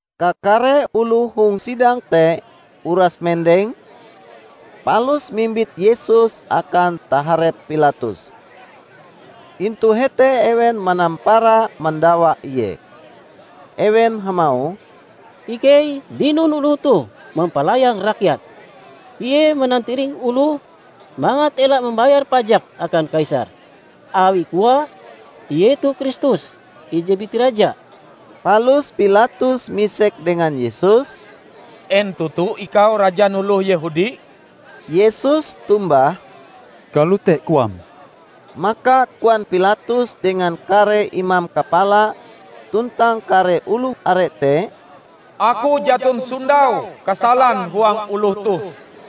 Kakare oloh hong sidang te uras mendeng, palus mimbit Yesus akan taharep Pilatus. Intu hete ewen manampara mandawa Ie. Ewen hamauh, "Ikei dinon oloh toh mampalayang rakyat. Ie manantiring oloh mangat ela mambayar pajak akan Kaisar, awi koae, ie toh Kristus, ije biti Raja." Palus Pilatus misek dengan Yesus, "En toto Ikau rajan oloh Yehudi?" Yesus tombah, "Kalote koam." Maka koan Pilatus dengan kare imam kapala tuntang kare oloh are te, "Aku jaton sondau kasalan huang oloh toh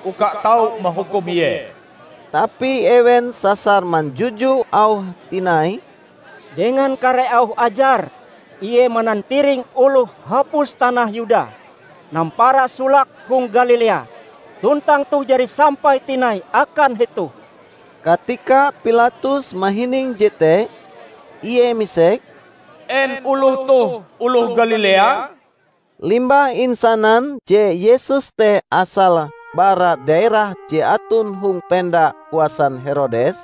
uka tau mahukum Ie." Tapi ewen sasar manjuju auhe tinai, "Dengan kare auh ajare, Ie manantiring oloh hapus tanah Yuda; nampara solake hong Galilea, tuntang toh jari sampai tinai akan hetoh." Katika Pilatus mahining jete, ie misek, "En oloh toh oloh Galilea?" Limbah insanan je Yesus te asale bara daerah je aton hong penda kuasan Herodes,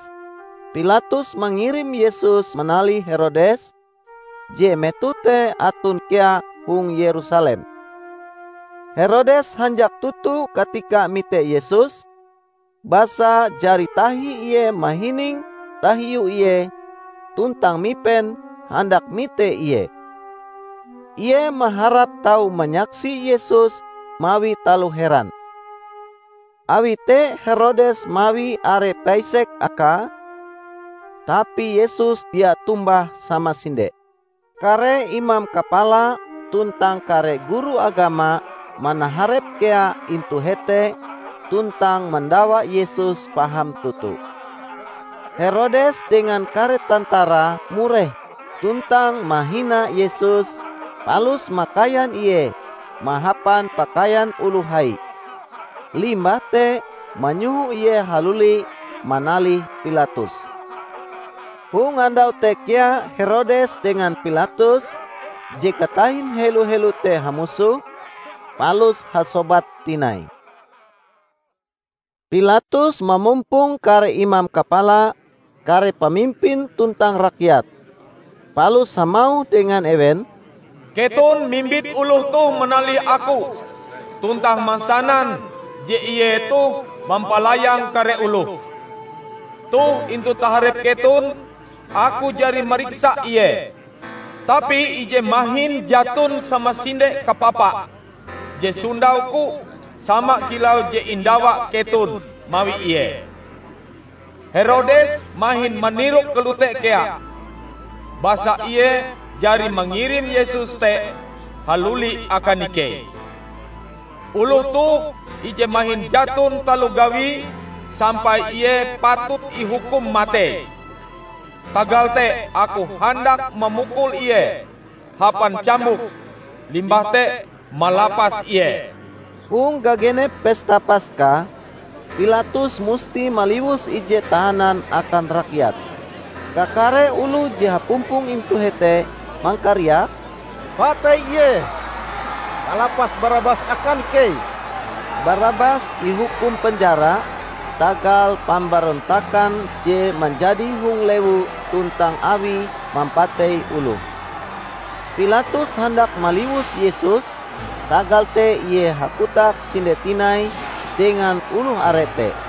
Pilatus mangirim Yesus manalih Herodes, je metoh te aton kea hong Yerusalem. Herodes hanjak toto katika mite Yesus, basa jari tahi ie mahining tahiu Ie tuntang mipen handak mite Ie. Ie maharap tau manyaksi Yesus mawi taloh heran. Awi te Herodes mawi are paisek akae, tapi Yesus dia tombah samasinde. Kare imam kapala tuntang kare guru agama manaharep kea intu hete tuntang mandawa Yesus paham toto. Herodes dengan kare tantara mureh tuntang mahina Yesus palus makaian Ie mahapan pakaian oloh hai, limbah te manyoho Ie haluli manalih Pilatus. Hong andau te kea Herodes dengan Pilatus, je katahin helo-helo te hamusoh, palus hasobat tinai. Pilatus mamumpong kare imam kapala, kare pamimpin tuntang rakyat, palus hamauh dengan ewen, "Keton mimbit oloh toh manalih Aku tuntang mansanan je Ie toh mampalayang kare oloh. Toh intu taharep keton aku jari mariksa Ie, tapi ije mahin jaton samasinde kapapa je sondau-Ku sama kilau je indawa keton mawi Ie. Herodes mahin manirok kalote kea, basa ie jari mangirim Yesus te haluli akan ikei. Oloh toh ije mahin jaton taloh gawie sampai Ie patut ihukum matei. Tagal te aku handak mamukul Ie hapan cambuk limbah te malapas Ie." [ Hong gagenep pesta Paska, Pilatus musti maliwus ije tahanan akan rakyat.] Kakare oloh je hapumpong intu hete mangkariak, "Patei Ie! Palapas Barabas akan ikei!" ( Barabas ihukum penjara tagal pambarontakan je manjadi hong lewu tuntang awie mampatei oloh.) Pilatus handak maliwus Yesus, tagal te Ie hakotak sinde tinai dengan oloh are te.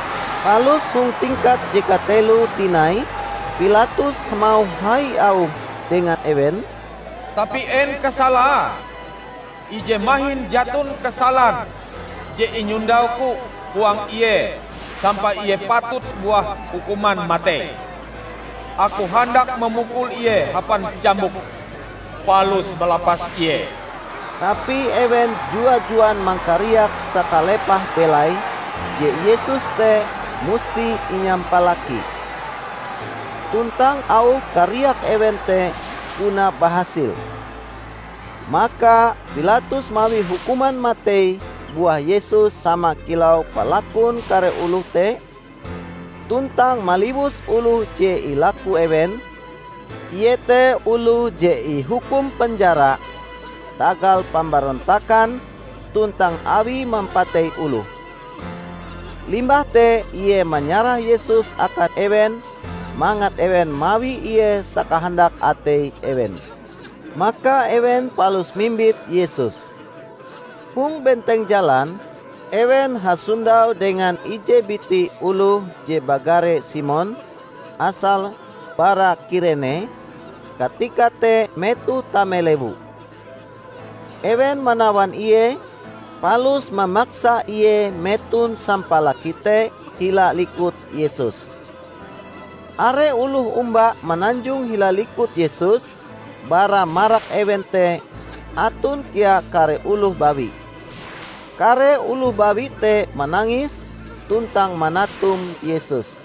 Palus hong tingkat je kateloe tinai Pilatus hamauh hai auhe dengan ewen, "Tapi en kasalae? Ije mahin jaton kasalan je inyondauku huang Ie sampai Ie patut buah hukuman matei! Aku handak mamukul Ie hapan cambuk, palus malapas Ie." Tapi ewen jua-juan mangkariak sakalepah belaie je Yesus te musti inyampalaki. Tuntang auh kariak ewen te puna bahasil. Maka Pilatus mawi hukuman matei buah Yesus sama kilau palakun kare oloh te, tuntang maliwus oloh je ilaku ewen, iete oloh je ihukum penjara tagal pambarontakan tuntang awie mampatei oloh. Limbah te ie manyarah Yesus akan ewen mangat ewen mawi Ie sakahandak atei ewen. Maka ewen palus mimbit Yesus. Hong benteng jalan, ewen hasondau dengan ije biti oloh je bagare Simon, asale bara Kirene, katika te metohe tame lewu. Ewen manawan ie, palus mamaksa ie meton sampalaki te hila likut Yesus. Are oloh omba mananjong hila likut Yesus -- bara marak ewen te aton kea kare oloh bawi. Kare oloh bawi te manangis tuntang manatum Yesus.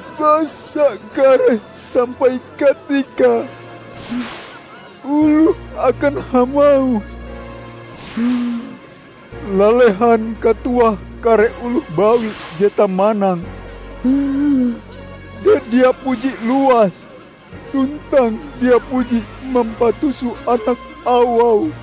Basa kareh sampai katikae oloh akan hamauh, 'Lalehan katuah kare oloh bawi je tamanang, je dia puji luas tuntang dia puji mampatuso anak awau!'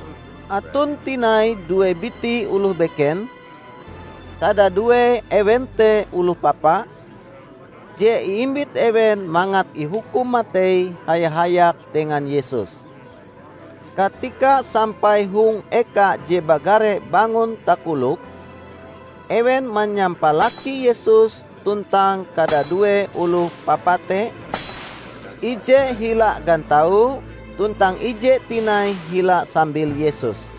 Aton tinai due biti oloh beken -- kadadue ewen te oloh papa -- je iimbit ewen mangat ihukum matei haya-hayak dengan Yesus. Katika sampai hong eka je bagare "Bangon Takolok", ewen manyampalaki Yesus tuntang kadadue oloh papa te -- ije hila gantau tuntang ije tinai hila sambil Yesus.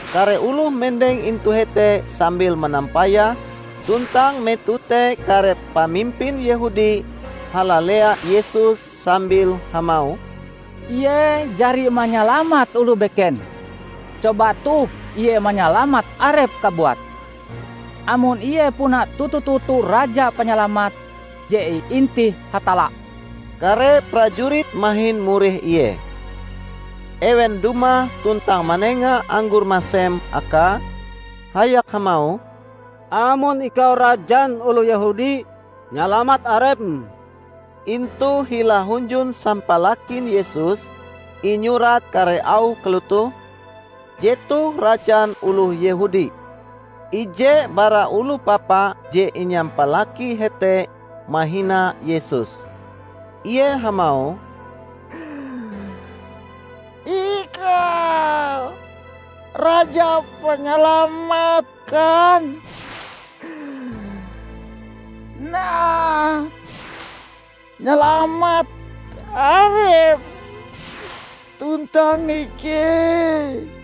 Kare oloh mendeng intu hete sambil manampayah tuntang metoh te kare pamimpin Yehudi halalea Yesus sambil hamauh, "Ie jari manyalamat oloh beken; coba toh Ie manyalamat Arepe kabuat, amon Ie puna toto-toto Raja Panyalamat je iintih Hatalla!" Kare prajurit mahin mureh Ie. Ewen dumah tuntang manenga anggor masem Akae hayak hamauh, "Amon Ikau rajan oloh Yehudi, nyalamat Arepm!" Intu hila hunjun sampalakin Yesus, inyurat kare auh kalotoh: "Jetoh Rajan Oloh Yehudi." Ije bara oloh papa je inyampalaki hete mahina Yesus. Ie hamauh, "Ikau Raja Panyalamat kan? Nah, nyalamat Arepm, tuntang ikei!"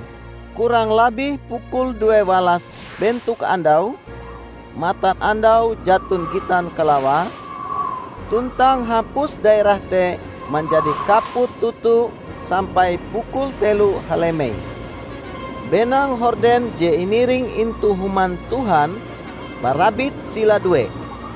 Kurang labih pukul due walas bentok andau, matanandau jaton gitan kalawae, tuntang hapus daerah te manjadi kaput toto sampai pukul telo halemei. Benang horden je iniring intu Human Tuhan, barabit sila due.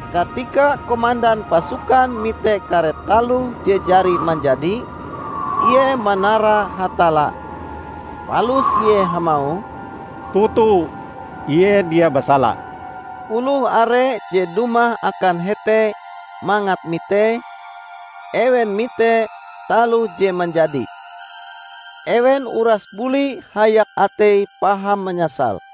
Katika komandan pasukan mite kare taloh je jari manjadi, ie manara Hatalla. Palus ie hamauh, "Toto, ie dia basala!" Oloh are je dumah akan hete mangat mitee, ewen mite taloh je manjadi. Ewen uras buli hayak ateie paham manyasal.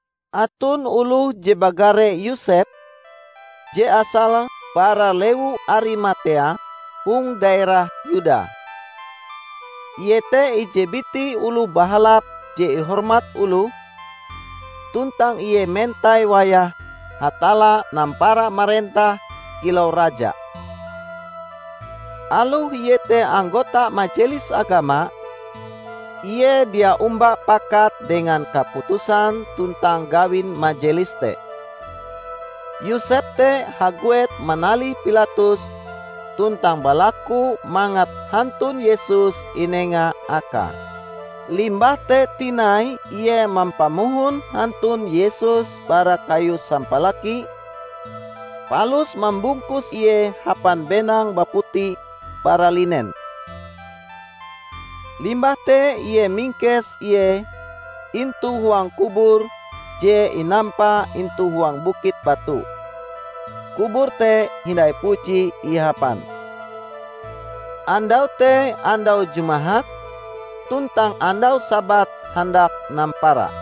Aton oloh je bagare Yosep, je asale bara lewu Arimatea hong daerah Yuda. Ie te ije biti oloh bahalap je ihormat oloh, tuntang ie mentai wayahe Hatalla nampara marentah kilau Raja. Aloh ie te anggota Majelis Agama, ie dia omba pakat dengan kaputusan tuntang gawin majelis te. Yosep te haguet manalih Pilatus tuntang balaku mangat hantun Yesus inenga akae. Limbah te tinai ie mampamohon hantun Yesus bara kayu sampalaki, palus mambungkus Ie hapan benang baputi bara linen. Limbah te ie mingkes Ie intu huang kubur je inampa intu huang bukit batu -- kubur te hindai puji ihapan. Andau te andau Jumahat; tuntang andau Sabat handak nampara.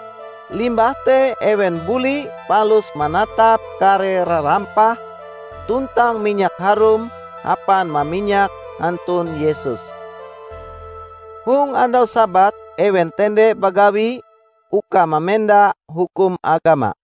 Limbah te ewen buli palus manatap kare rarampah tuntang minyak harum hapan maminyak hantun Yesus. Hong andau Sabat ewen tende bagawi uka mamenda hukum agama.